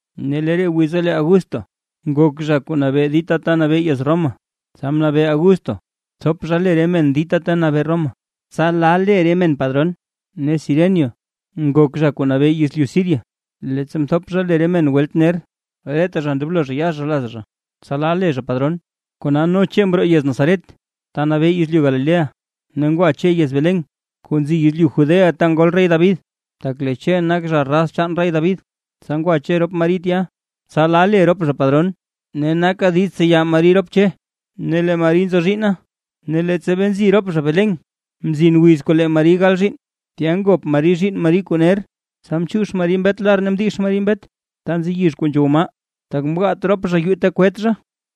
Ne lee re wiza lee Augusto nak zha kuu nabee dita ta nabee yez Roma, tsa mnabee Augusto thop zha le re men dita ta nabee Roma, tsa la le re men padron. Ne Ciren nak zha kuu nabee yezlyu Siria, leettsa mthop zha le re men welt ner. Reta zha ndoblo zha ya zha laz zha, tsa la le zha padron. Kona, no Che mroo yez Nazaret, ta nabee yezlyu Galilea, ne ngwa Che yez Belén kuu nzi yezlyu Judea ta ngol rey David, tak lee Che nak zha raz chaan rey David. Tsa ngwa Che rop Mari tya, tsa la le rop zha padron ne naka diiz tseya Mari rop Che, ne lee Mari nzo zhiinna. Ne leettsa bee nzi rop zha Belén, mzin wiz kuu lee Mari gal zhiinn. Tya ngop Mari zhiinn Mari kuu ner, tsa mchiix Mari mbet lar ne mdix Mari mbet ta nzi yizh kuu nzhow maa, tak mgaat rop zha yuu ta gabet zha.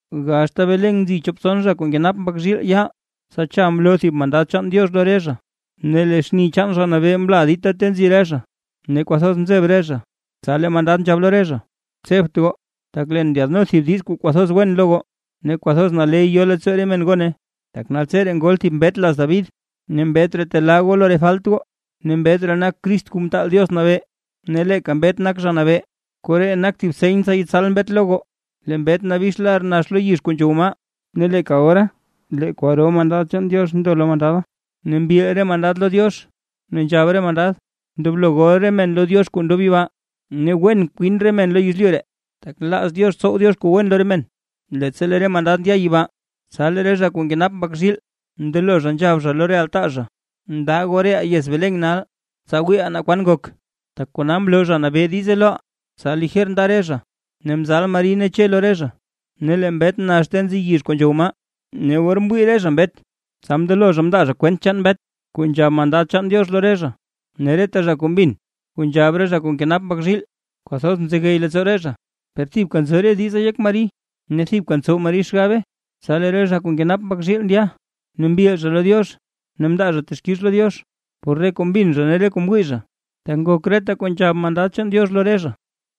Gaxta Belén nzi chop tson zha kuu nkenap mbak zhiilee yaal. Tsa cha mloo thib mandad chaan Diox lo re zha, ne lee xni chaan Zha Nabee mla dita ta nzi re zha, tsa kwathoz mzeb re zha. Tsa lee mandad nzhab lo re zha: ―Tsebt goo, tak leen ndyaadno thib diiz kuu kwathoz wen lo goo, ne kwathoz naley yo leettsoo re men gone. Tak naltseree ngol thib mbet laz David, ne mbet ree telaa goo lo re falt goo. Ne mbet ree nak Crist Kuu Mtaal Diox Nabee, ne leeka mbet nak Zha Nabee. Koree nak thib seny tsa yetsal mbet lo goo, lee mbet nabix lar nax lo yizh kuu nzhow maa. Ne leeka ora lee kwaro mandad chaan Diox mndo lo mandada, ne mbil re mandad lo Diox ne nzhab re mandad: ¡Ndoblo gol re men lo Diox kuu ndob yibaa! ¡Ne wen kwin re men lo yezlyu ree, tak nlaaz Diox tsow Diox kuu wen lo re men! Leettsa lee re mandad ndya yibaa, tsa lee re zha kuu nkenap mbak zhiil mndelo zha nzhab zha lo re altaa zha: ―Ndaa goo reʼaa yez Belén nal, tsa wiiʼaa naa kwan ngok, tak kona mloo Zha Nabee diize loʼaa. Tsa lijer nda re zha, ne mzal Mari ne Che lo re zha, ne lee mbet nax ta nzi yizh kuu nzhow maa. Ne or mwii re zha mbet, tsa mndelo zha mndaa zha kwent chaan mbet, kuu nzhab mandad chaan Diox lo re zha, ne reta zha kuu mbin kuu nzhab re zha kuu nkenap mbak zhiil, kwathoz mzegey leettsoo re zha. Per thibka nzo re diza yek Mari, ne thibka ntsow Mari xgabe. Tsa lee re zha kuu nkenap mbak zhiil ndya, ne mbil zha lo Diox ne mndaa zha texkix lo Diox, por re kuu mbin zha ne re kuu mwii zha, tak ngok reta kuu nzhab mandad chaan Diox lo re zha.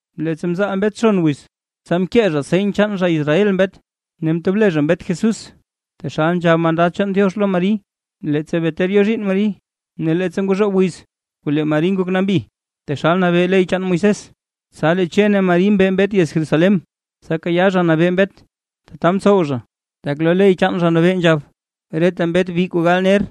Leettsa mzaal mbet xon wiz, tsa mkee zha seny chaan zha Israel mbet, ne mtob le zha mbet Jesús, taxal nzhab mandad chaan Diox lo Mari, leettsa bee ter yo zhiinn Mari. Ne leettsa ngwazhoob wiz kuu lee Mari ngok nambi, taxal nabee ley chaan Moisés, tsa lee Che ne Mari mbe mbet yez Jerusalén, tsa kayaa Zha Nabee mbet. Tata mtsow zha, tak lo ley chaan Zha Nabee nzhab: “Reta mbet bi kuu gal ner,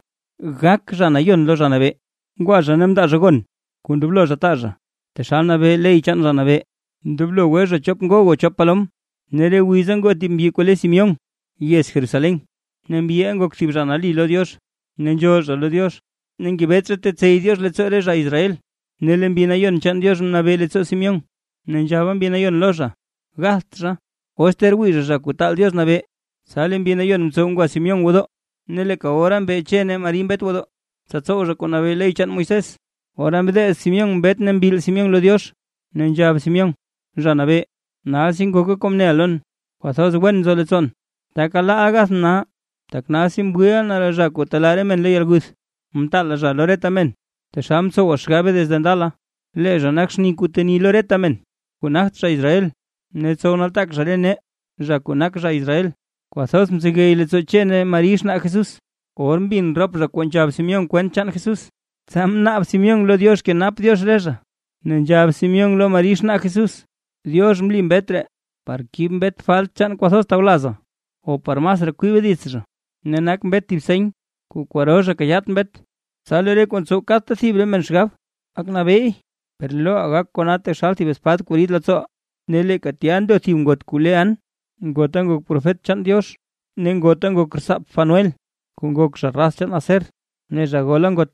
gak zha nayon lo Zha Nabee”. Ngwa zha ne mndaa zha gon kuu ndoblo zha taa zha, taxal nabee ley chaan Zha Nabee: “Ndoblo gwe zha chop ngog o chop palom”. Ne re wiza ngoo thib mbyi kuu le Simeón yez Jerusalén. Ne mbyiʼa nak thib zha nali lo Diox, ne nzhool zha lo Diox, ne ngebet zha tetsey Diox leettsoo re zha Israel. Ne lee Mbi Nayon chaan Diox mnabee leettsoo zha, ne nzhaba Mbi Nayon lo zha gatht zha, os ter wii zha, zha kuu taal Diox nabee. Tsa lee Mbi Nayon mtsow ngwa Simeón gwodoo, ne leeka ora mbe Che ne Mari mbet gwodoo, tsa tsow zha kuu nabee ley chaan Moisés. Ora mdeez Simeón mbet ne mbil Simeón lo Diox ne nzhab Simeón: Zha Nabee, nalsi ngoka kuu mneʼa lon, kwathoz wen nzo leettsoon, taka laaʼa gathʼn nal. Tak nalsi mwiiʼa na zha kuu telaa re men lo yalguth, mtaala zha lo reta men taxal mtsowa xgabe desde ndala. Lee zha nak xni kuu teni lo reta men kuu nagt zha Israel, ne tsow nataak zha re nee, zha kuu nak zha Israel. Kwathoz mzegey leettsoo Che ne Mari xnaa Jesús, or mbin rop zha kuu nzhab Simeón kwent chaan Jesús. Tsa mnaab Simeón lo Diox kenap Diox re zha, ne nzhab Simeón lo Mari xnaa Jesús: ―Diox mli mbet ree par kib mbet falt chaan kwathoz tawlazaa o par masraa kwibe dits zha, ne nak mbet thib seny kuu kwaro zha kayaat mbet, tsa lee re kuu ntsow kadta thib re men xgab gak nabeey. Per lee loʼa gak kona taxal thib espad kuu rid leettsooʼa. Ne leeka tya ndo thib ngot kuu le An, ngota nak profet chaan Diox, ne ngota nak rtsaap Fanuel kuu nak zha raz chaan Aser, ne zha gola ngot.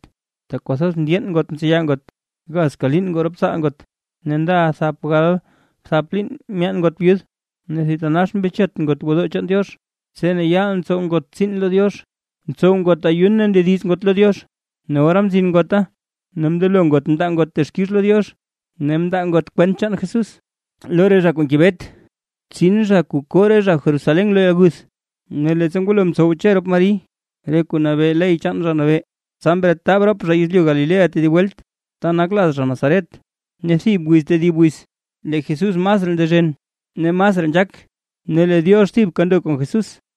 Tak kwathoz mndyeen ngot mtseya ngot, gazka liin ngoo rop tsaal ngot, ne ndaʼa thap galbthap liin myaan ngot byud. Ne thitanax mbechet ngot gwodoo chaan Diox, tse ne yaal ntsow ngot tsiin lo Diox ntsow ngot ayun ne ndediz ngot lo Diox. Ne ora mzin ngota ne mndelo ngot mndaa ngot texkix lo Diox, ne mndaa ngot kwent chaan Jesús, lo re zha kuu ngebet tsin zha kuu koo re zha Jerusalén lo yalguth. Ne leettsa ngwalo mtsow Che rop Mari re kuu nabee ley chaan Zha Nabee, tsa mretab rop zha yezlyu Galilea tedib welt, ta nak laz zha Nazaret. Ne thib wiz tedib wiz lee Jesús masraa ndezhen ne masraa nzhaak, ne lee Diox thibka ndo kon Jesús.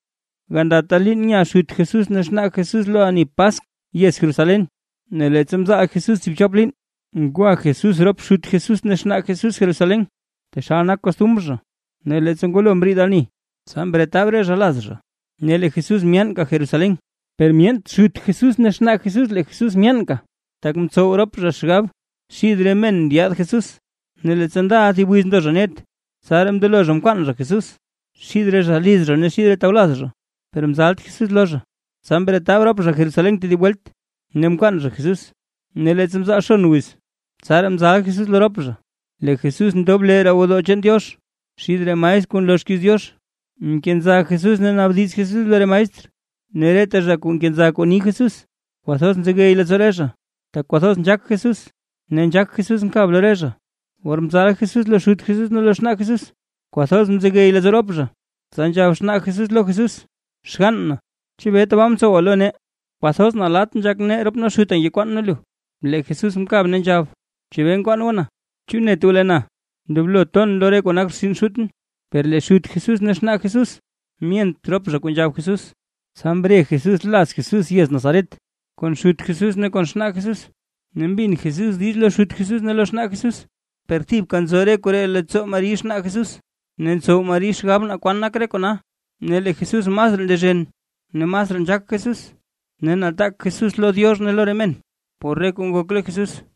Gandata liin nya xut Jesús ne xnaa Jesús lo ani Paskw yez Jerusalén. Ne leettsa mzaal Jesús tsiibchop liin, ngwa Jesús rop xut Jesús ne xnaa Jesús Jerusalén, taxal nak Kostumr zha. Ne leettsa ngwalo mriid ani, tsa mretab re zha laz zha, ne lee Jesús myaanka Jerusalén, per myeent xut Jesús ne xnaa Jesús lee Jesús myaanka. Tak mtsow rop zha xgab xid re men ndyaad Jesús, ne leettsa ndaʼa thib wiz ndo zha net. Tsaraa mndelo zha mkwaan zha Jesús xid re zha liz zha ne xid re tawlaz zha, per mzalt Jesús lo zha. Tsa mretab rop zha Jerusalén tedib welt, ne mkwaan zha Jesús. Ne leettsa mzaal tson wiz tsaraa mzal Jesús lo rop zha. Lee Jesús ndob lee roo gwodoo chaan Diox xid re maestr kuu nloo xkiiz Diox, nkenza Jesús ne naabdiz Jesús lo re maestr. Ne reta zha kuu nkenza kuu ni Jesús, kwathoz nzegey leettsoo re zha, tak kwathoz nzhaak Jesús, ne nzhaak Jesús nkab lo re zha. Or mzal Jesús lo xut Jesús ne lo xnaa Jesús, kwathoz mzegey leettsoo rop zha, tsa nzhab xnaa Jesús lo Jesús: ―Xgann na, ¿chebee tabaa mtsowa lo nee? Kwathoz nalatt nzhak rop nee xuta ngekwaan nee lu. Lee Jesús mkab ne nzhab: ―¿Chebee nkwaan goo na? ¿Chu net goo lee na ndoblo ton lo re kuu nak rtsin Xutʼn? Per lee xut Jesús ne xnaa Jesús myent rop zha kuu nzhab Jesús. Tsa mre Jesús laz Jesús yez Nazaret kon xut Jesús ne kon xnaa Jesús, ne mbin Jesús diiz lo xut Jesús ne lo xnaa Jesús. Per thibka nzo re koree leettsoo Mari xnaa Jesús ne ntsow Mari xgab naa kwan nak re kona. Ne lee Jesús masraa ndezhen, ne masraa nzhaak Jesús, ne nataak Jesús lo Diox ne lo re men por re kuu ngok lo Jesús.